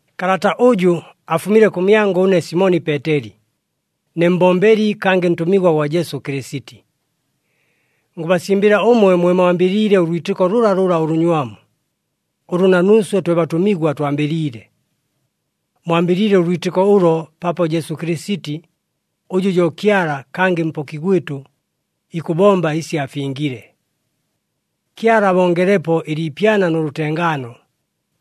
Kalata ʉjʉ afumile kʉmyangʉ ʉne Simoni Peeteli, ne mbombeli kangɨ ntʉmigwa gwa Jesu Kɨlɨsiti. Ngʉbasimbɨla ʉmwe mwe mwambɨliile ʉlwitɨko lʉlalʉla ʉlʉnywamu, ʉlʉ na nuuswe twe batʉmigwa twambɨliile. Mwambɨliile ʉlwitɨko ʉlo paapo Jesu Kɨlɨsiti, ʉjʉ jo Kyala kangɨ Mpoki gwɨtʉ, ikʉbomba ɨsi afingile. Kyala abongelepo ɨliipyana nʉ lʉtengaano,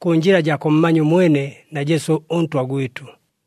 kʉ njɨla jaa kʉmmanya ʉmwene na Jesu ʉNtwa gwɨtʉ.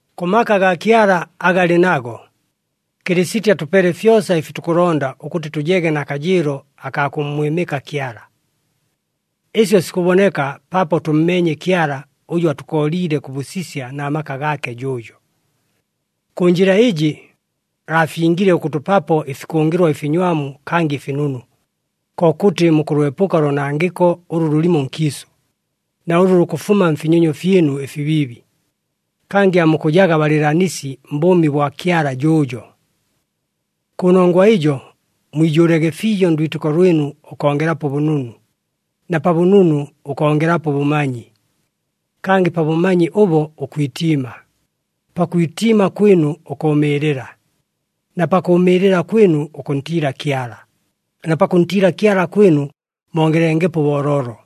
Kʉ maka agaa Kyala aga alɨ nago, Kɨlɨsiti atʉpeele fyosa ɨfi tukʉlonda ʉkʉtɨ tʉjege na kajɨɨlo akaa kʉmmwɨmɨka Kyala. Ɨsyo sikʉboneka paapo tʉmmeenye Kyala ʉjʉ atʉkooliile kʉ bʉsisya na maka gaake jʉʉjo. Kʉ njɨla ɨjɨ, aafingile ʉkʉtʉpapo ɨfikʉngɨlwa ɨfinywamu kangɨ ɨfinunu, kokʉtɨ mukʉlwepʉka ʉloonangɨko ʉlʉ lʉlɨmo nkiisʉ, na ʉlʉ lukʉfuma mfinyonyo fyɨnu ɨfibiibi, kangɨ aamukʉjaga balɨɨlanisi mbʉʉmi bwa Kyala jʉʉjo. Kʉnongwa ɨjo, mwijʉʉlege fiijo ndwitɨko lwɨnu ʉkongelapo ʉbʉnunu, na pa bʉnunu ʉkongelapo ʉbʉmanyi. Kangɨ pa bʉmanyi ʉbo ʉkwitiima, pakwitiima kwɨnu ʉkʉʉmɨɨlɨla, na pakʉʉmɨɨlɨla kwɨnu ʉkʉntiila Kyala, na pakʉntiila Kyala kwɨnu mongelengepo ʉbooloolo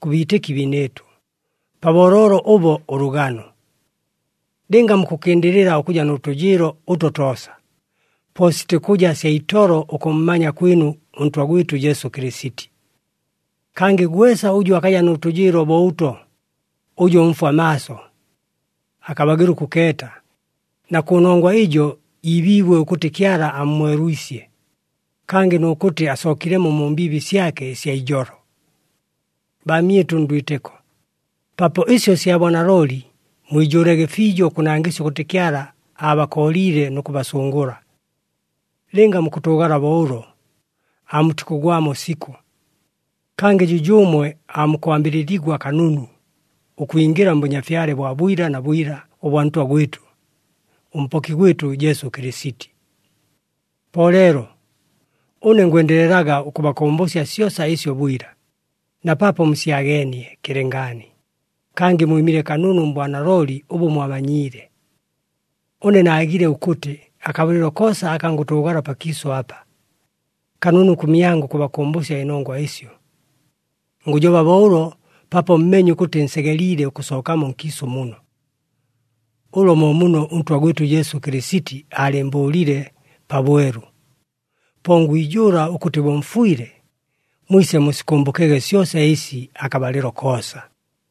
kʉ biitɨki biinɨɨtʉ, pa booloolo ʉbo, ʉlʉgano. Lɨnga mukʉkɨndɨlɨla ʉkʉja nʉ tʉjɨɨlo ʉto toosa, po sitikʉja sya itolo ʉkʉmmanya kwɨnu ʉNtwa gwɨtʉ Jesu Kɨlɨsiti. Kangɨ gwesa ʉjʉ akaja nʉ tʉjɨɨlo bo ʉto, ʉjo mfwa maaso. Akabagɨla ʉkʉkeeta, na kʉnongwa ɨjo iibiibwe ʉkʉtɨ Kyala ammwelwisye, kangɨ nʉ kʉtɨ asookilemo mu mbiibi syake ɨsya ijolo. Baamyɨtʉ ndwitɨko, paapo ɨsyo sya bwanalooli, mwijʉʉlege fiijo ʉkʉnangɨsya ʉkʉtɨ Kyala aabakooliile nʉ kʉbasʉngʉla. Lɨnga mukʉtʉʉgala bo ʉlo, aamutikʉgwamo sikʉ. Kangɨ jʉjʉʉmwe aamukwambɨlɨligwa kanunu, ʉkwingɨla mBʉnyafyale bwa bwila na bwila ʉbwa Ntwa gwɨtʉ, ʉMpoki gwɨtʉ Jesu Kɨlɨsiti. Po leelo, ʉne ngwendelelaga ʉkʉbakʉmbʉsya syosa ɨsyo bwila, na paapo musyageenie kɨlɨngaani, kangɨ mwɨmile kanunu mbwanalooli ʉbʉ mwamanyiile. Ʉne naagile ʉkʉtɨ, akabalɨlo koosa aka ngʉtʉʉgala pakiisʉ apa, kanunu kʉmyangʉ ʉkʉbakʉmbʉsya ɨnongwa ɨsyo. Ngʉjoba bo ʉlo paapo mmeenye ʉkʉtɨ nsegeliile ʉkʉsookamo nkiisʉ muno. Ʉlo mo muno ʉNtwa gwɨtʉ Jesu Kɨlɨsiti aalɨɨmbʉʉlile pabwelu. Po ngwijʉʉla ʉkʉtɨ bo mfwile, mwise musikʉmbʉkege syosa ɨsi akabalɨlo koosa.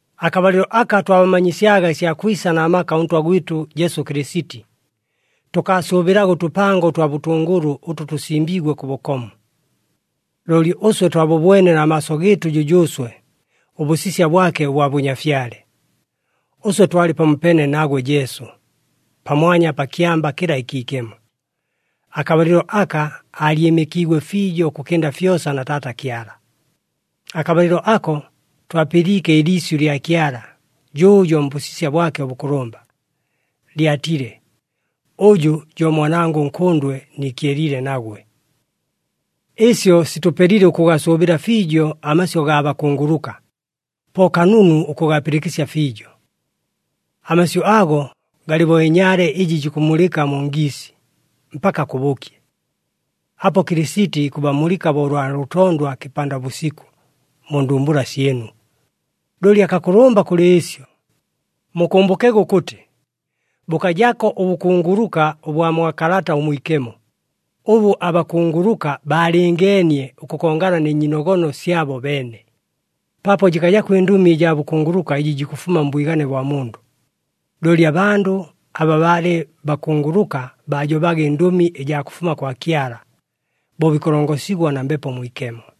Akabalɨlo aka twabamanyisyaga ɨsya kwisa na maka ʉNtwa gwɨtʉ Jesu Kɨlɨsiti, tʉkaasʉʉbɨlaga ʉtʉpango ʉtwa bʉtʉngʉlʉ ʉtʉ tʉsimbiigwe kʉ bʉkomu. Looli ʉswe twabʉbwene na maaso gɨɨtʉ jʉjʉʉswe ʉbʉsisya bwake ʉbwa bʉnyafyale. Ʉswe twalɨ pamopeene nagwe Jesu, pamwanya pa kyamba kɨla ɨkiikemo, akabalɨlo aka aalyɨmɨkiigwe fiijo ʉkʉkɨnda fyosa na Taata Kyala. Akabalɨlo ako, twapɨliike ɨliisyʉ lya Kyala jʉʉjo mbʉsisya bwake ʉbʉkʉlʉmba, lyatile, “Ʉjʉ jo Mwanangʉ ʉNkʉndwe, niikyeliile nagwe.” Ɨsyo sitʉpelile ʉkʉgasʉʉbɨla fiijo amasyʉ gaa bakunguluka, po kanunu ʉkʉgapɨlɨkɨsya fiijo. Amasyʉ ago galɨ bo ɨnyaale ɨjɨ jikʉmulɨka mu ngiisi, mpaka kʉbʉkye. Apo Kɨlɨsiti ikʉbamulɨka bo ʉlwa lʉtondwa kɨpanda bʉsikʉ, mu ndumbula syɨnu. Looli akakʉlʉmba kʉlɨ ɨsyo, mukʉmbʉkege ʉkʉtɨ bʉkajako ʉbʉkunguluka ʉbwa mwa Kalata ʉMwikemo ʉbʉ abakunguluka baalɨngeenie ʉkʉkongana nɨ nyiinogono syabo beene, paapo jɨkajako ɨndʉmi ɨjaa bʉkunguluka ɨjɨ jikʉfuma mbwigane bwa mundʉ. Looli abandʉ aba baalɨ bakunguluka baajobaga ɨndʉmi ɨjaa kʉfuma kwa Kyala, bo bikʉlongosigwa na Mbepo Mwikemo.